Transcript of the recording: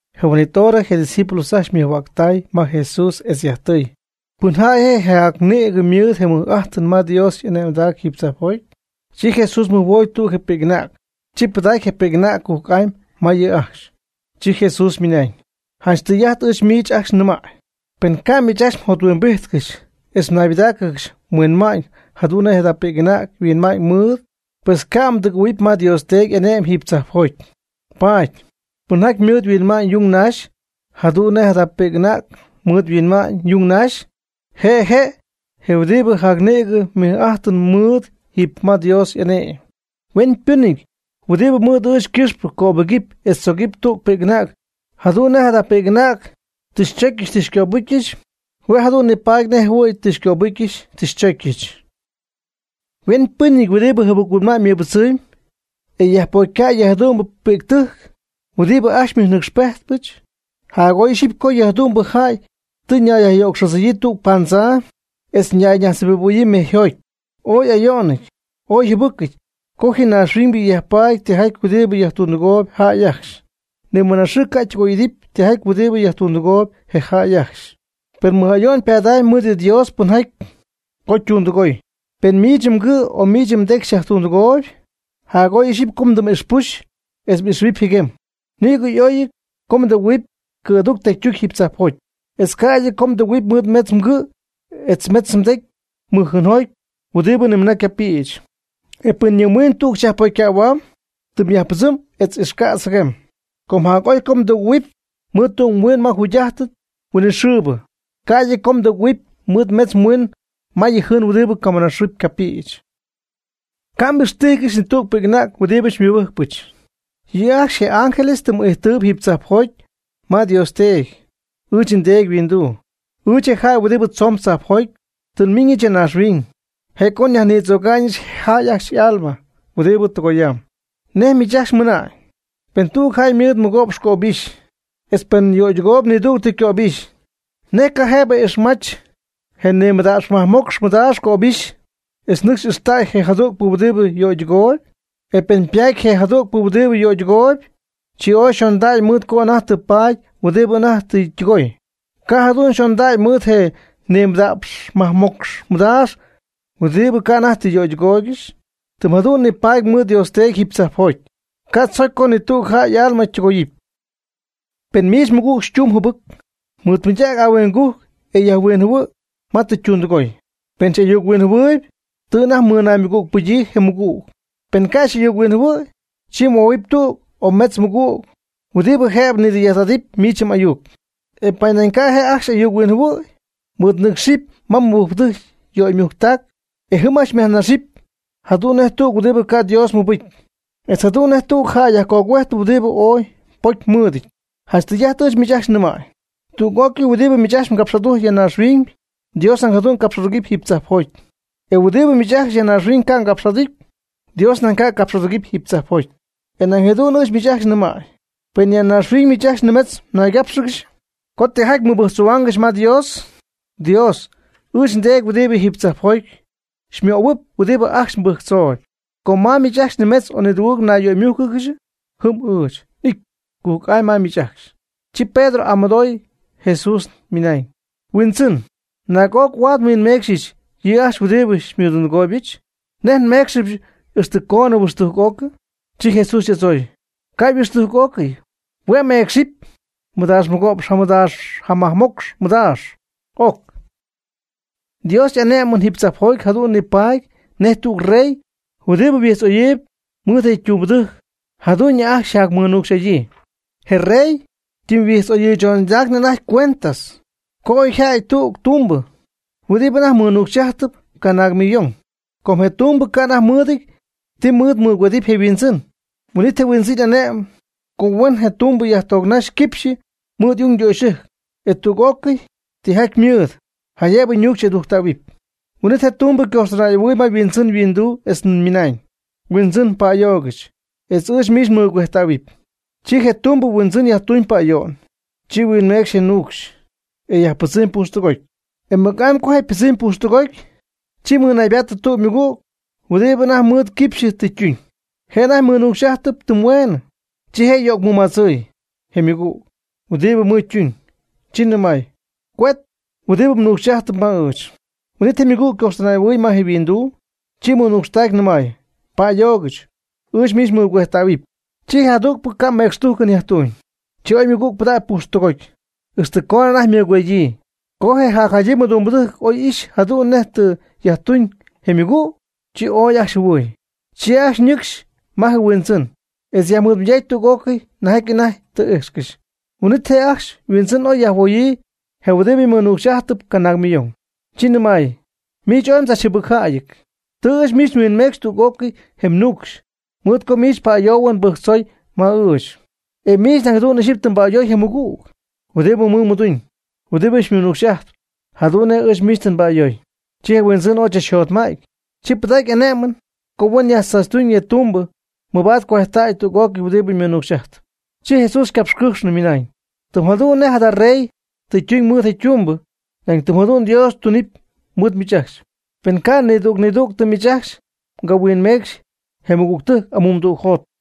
Je huin'it hora je' ydiscípulos ajcxy ymɨjhuäctay Jesús etz yajtɨy: ―¿Pɨnjäy je'jac nïg ymɨɨd je mɨj'ajtɨn ma Dios y'ane'my jiiby tzajpjoty? Chi Jesús mɨjhuoy tüg je pi'c'anäg. Chi pɨdacy je pi'c'anäg cujc'amy ma yɨ' ajcxy. Chi Jesús ymɨnañ: ―Janch tɨy'ajt ɨɨch miich ajcxy nɨmäy, pen ca' miich ajcxy jothuimbijtcɨxy etz naybɨdaaccɨxy mhuinma'ñ jadu'n nej jada pi'c'anäg huinma'ñ mɨɨd, pues ca' mdɨgɨ̈huɨpy ma Dios Teedy y'ane'my jiiby tzajpjoty. Paady, pɨnjaty mɨɨd yhuinma'ñ yung nax jadu'n nej jadayaabɨ pi'c'anäg mɨɨd yhuinma'ñ yung nax, je' je' je huɨdiib jac nïgɨ mɨj'ajtɨn ymɨɨd jiiby ma Dios y'ane'my. Hueñypɨnɨty huɨdibɨ mɨɨd ɨɨch ycɨxpɨ cöbɨgɨpy etz tzogɨpy tüg pi'c'anäg, jadu'n nej jada pi'c'anäg tɨ ndzocyɨch tɨ ngöbɨcyɨch, hue' jadu'n nipaady nej jɨhuɨ̈y tɨ xycöbɨcyɨch tɨ xychocyɨch. Hueñypɨnɨty huɨdibɨ jɨbɨc-huinma'ñ ymɨbɨdzɨmy, e yajpocycäy yɨ jadu'mbɨ pi'ctɨjc huɨdibɨ ajcxy xymɨjnɨcxpejtpɨch, jac'oy ixyipy co yɨ jadu'mbɨ jäy ytimyñayyöcxodzɨ̈yii tüg paandzaa etz ñayñajtzjɨbibɨ̈huɨpy mejyjoty. Ooy ayo'ñɨty ooy jɨbɨcɨty co ji naaxhuiñybɨ yajpaady tijaty huɨdibɨ yajtundɨgooby jäy ajcxy. Ni mɨna xɨɨ ca' tɨgoy y'idɨpy tijaty huɨdi yajtundɨgoy je jäy ajcxy. Per mɨj ayo'n pada'ñ mɨɨd yɨ Dios pɨnjaty cojp tundɨgooyɨɨ. Pen miich mgɨ' o miich mdecy xyajtundɨgooyb, jac'oy ixyipy co mdɨm'ixpuxy etz ixjɨbɨpy jɨguem. Nïgɨ oy co mdɨgɨ̈huɨpy cɨ̈duc tecytuc jiiby tzajpjoty etz ca'ydɨ co mdɨgɨ̈huɨpy mɨɨd metz mgɨ' etz metz mdecy mɨjjɨɨnjoty huɨdibɨ nimɨna ycapïch. E pen yɨ mhuiin tug xyajpocycähuamb, tɨm yajpɨdzɨm etz ixcätz jɨguem. Com jac'oy mdɨgɨ̈huɨpy mɨɨd tüg mhuiin ma jugy'ájtɨn huinɨxɨɨbɨ, ca'ydɨ co mdɨgɨ̈huɨpy mɨɨd metz mhuiin ma yɨ jɨɨn huɨdibɨ camɨna xɨɨ ycapïch. Ca' m'ixtijcɨxy ni tüg pi'c'anäg huɨdibɨ xymɨbɨjcpɨch. Yɨ' ajcxy je' y'ángeles tɨm ijtɨɨb jiiby tzajpjoty ma Dios Teedy, ɨɨch nDeedy yhuinduu. Ɨɨch je jäy huɨdibɨ tzoon tzajpjoty, tɨ nmiiñɨch ya naaxhuiñ, je' co nyajnitzöga'ñɨch je jäy ajcxy y'alma huɨdibɨ tɨgoyam. ¿Nej miich ajcxy mɨna'ñ? Pen tüg jäy ymɨɨd mɨgo'px cöbixy, etz pen yöydɨgooyb nidügtɨ cöbixy, ¿nej ca' jëbɨ ixmach je nimɨda'px majmocx mɨdaax cöbixy etz nɨcxy ixtäy je jadügpɨ huɨdibɨ yöydɨgooy? E pen ypatpy je tügpɨ huɨdibɨ yöydɨgooyb, chi ooy xondägy mɨɨd co anajty tɨ paady huɨdibɨ anajty tɨ ytɨgooy, ca' jadu'n yxondägy mɨɨd je nimɨda'px majmocx mɨdaax huɨdibɨ ca' anajty tɨ yöytɨgooygɨxy. Tɨm jadu'n nipaady mɨɨd Dios Teedy jiiby tzajpjoty, ca' tzocy co ni tüg jäy y'alma tɨgoyɨpy. Pen miich mmɨgüg xytuñ jɨbɨc, mɨɨdmɨydac ahuingujc e yajhuinjɨhuɨ' ma tɨ ytundɨgooy, pen xy'ayuchuinjɨhuɨɨyb tɨ anajty mmɨnaymɨgügpɨgyii je mmɨgüg. Pen ca' xy'ayuc-huinjɨhuɨ̈y, chi huoominɨpy tüg o metz mmɨgüg huɨdibɨ jëbɨ nidɨy'ajt'adɨpy miich m'ayuc. E pen nañ ca' je' ajcxy ayuc-huinjɨhuɨ̈hua'ñ, mɨɨdnɨcxɨp ma mɨbɨjcpɨdɨjc yöymujctac e jɨm ajcxy myajnaxɨpy jadu'n nej tüg huɨdibɨ ca' Dios mɨbɨcy etz jadu'n nej tüg yajcogüejtpɨ huɨdibɨ ooy pocymɨɨdɨty. Janch tɨy'ajt ɨɨch miich ajcxy nɨmäy, tüg'ócɨy huɨdibɨ miich ajcxy mgapx'adujcpy ya naaxhuiñ, Dios nañ jadu'n capx'adugɨpy jiiby tzajpjoty, e huɨdibɨ miich ajcxy ya naaxhuiñ ca' capx'aducy, Dios nañ ca' capx'adugɨpy jiiby tzajpjoty. E nañ jadu'n ɨɨch miich ajcxy nɨmäy, pen ya naaxhuiñ miich ajcxy nimetz mnaygápxɨgɨxy co tijaty mmɨbɨjctzohuaangɨxy ma Dios, Dios, ɨɨch nDeedy huɨdibɨ jiiby tzajpjoty, xymöhuɨpy huɨdibɨ ajcxy mbɨjctzooyb. Com ma miich ajcxy nimetz o nidugɨɨg naymújcɨgɨxy, jɨm ɨɨch n'ity cujc'amy ma miich ajcxy. Chi Pedro y'amɨdooy Jesús ymɨnañ: ―Huindzɨn, ¿naag'oc huaad nhuinmeecxyɨch yɨ' ajcxy huɨdibɨ xymɨdundɨgooybɨch? ¿Nej nméecxɨbɨch ixtɨ coonɨ huɨxtujc'ocɨ? Chi Jesús y'adzooy: ―Ca' yhuɨxtujc'ócɨty, hue' meecxɨpy mɨdaax mɨgo'px jamɨda'px majmocx mɨdaax'oc. Dios y'ane'mɨn jiiby tzajpjoty jadu'n nipaady nej tüg rey huɨdibɨ huijtz'oyɨɨyb mɨɨd je ytumbɨdɨjc jajadu'ñɨ ajcxy yjacmɨnucxy'adyii. Je rey ytɨmyhuijtz'oyɨɨychondacyñɨ anajty cuentas, co oy yjädy tüg ytumbɨ huɨdibɨ anajty mɨnuucxy'ajtɨp canaag millón. Com je' ytumbɨ ca' anajty mɨɨdɨty ti mɨɨd mɨgüedɨɨb je' yhuindzɨn. Huin'it je huindzɨn ane'my co huen je' ytumbɨ yajtoocnax quipxyɨ mɨɨd y'ungdöxyɨjc etz tüg'ócɨy tijaty ymɨɨd, jaydëb ñuucxy y'adujctähuɨpy. Huin'it ytumbɨ ycoxtɨnay'ɨhuɨɨy ma yhuindzɨn yhuinduu etz nɨmay: “Huindzɨn, pa'ayoogɨch, etz ɨɨch miich nmɨgüejtähuɨpy.” Chi je tumbɨ yhuindzɨn yajtuñ pa'ayo'n, chi huinmeecxɨp je nuucxy, e yajpɨdzɨmy pujxtɨgoty. E mɨc'amy co je' ypɨdzɨmy pujxtɨgoty, chi ymɨnaybatɨ tüg ymɨgüg huɨdibɨ anajty mɨɨd quipxyɨ tɨ ytuñ. Je' anajty mɨnuucx'ajtɨp tɨm hueenɨ, chi je' yöcmɨmadzɨy je' ymɨgüg huɨdibɨ mɨɨd ytuuñ, chi nɨmay: “Cuet huɨdibɨ mnuucx'ajtpy ma ɨɨch.” Huin'it ymɨgüg ycojxtɨnay'ɨhuɨɨy ma je' yhuinduu. Chi mɨnuucxtaacy nɨmay: “Pa'ayoogɨch. Ɨɨch miich nmɨgüejtähuɨpy.” Chi je jadügpɨ ca' mecxtujcɨn yajtuuñ. Chi oy ymɨgüg pɨdägy pujxtɨgoty, ixtɨ coonɨ anajty mɨcuedyii. Co je jacjadyii ymɨdumbɨdɨjc oy ixy jadu'n nej tɨ yajtuñ je' ymɨgüg, chi ooy ajcxy jɨhuɨɨy. Chi ajcxy nɨcx ma je yhuindzɨn etz yajnɨmayday tüg'ócɨy nejjaty anajty tɨ ijxcɨxy. Huin'it je' ajcxy yhuindzɨn oy yajhuoyii je huɨdibɨ mɨnuucx'ajtɨp canaag millón. Chi nɨmay: “Miich ooy mdzachjɨbɨcjäyɨty. Tɨ ɨɨch miich nhuinmeecxɨ tüg'ócɨy je mnuucxy, mɨɨd co miich pa'ayoohuɨn mbɨjctzooy ma ɨɨch. E miich nañ jadu'n ixyipy tɨ mba'ayoy je mɨgüg huɨdibɨ mɨɨd mmɨduñ, huɨdibɨ xymɨnuucxy'ajtp, jadu'n nej ɨɨch miich tɨ nba'ayooy.” Chi je huindzɨn ooy chachjotma'ty, chi pɨdacy ane'mɨn co huen yajtzaachytuñ je' ytumbɨ mabaad cuejttäy tüg'ócɨy huɨdibɨ ñuucxy'ajtpy. Chi Jesús ycapxycɨ́jxnɨ, mɨnañ: ―Tɨm jadu'n nej jada rey tɨ tuñ mɨɨd je ytumbɨ, nañ tɨm jadu'n Dios tunɨpy mɨɨd miich ajcxy, pen ca' nidüg nidügtɨ miich ajcxy ca' mhuinmeecxy je mmɨgügtɨjc amumdügjot.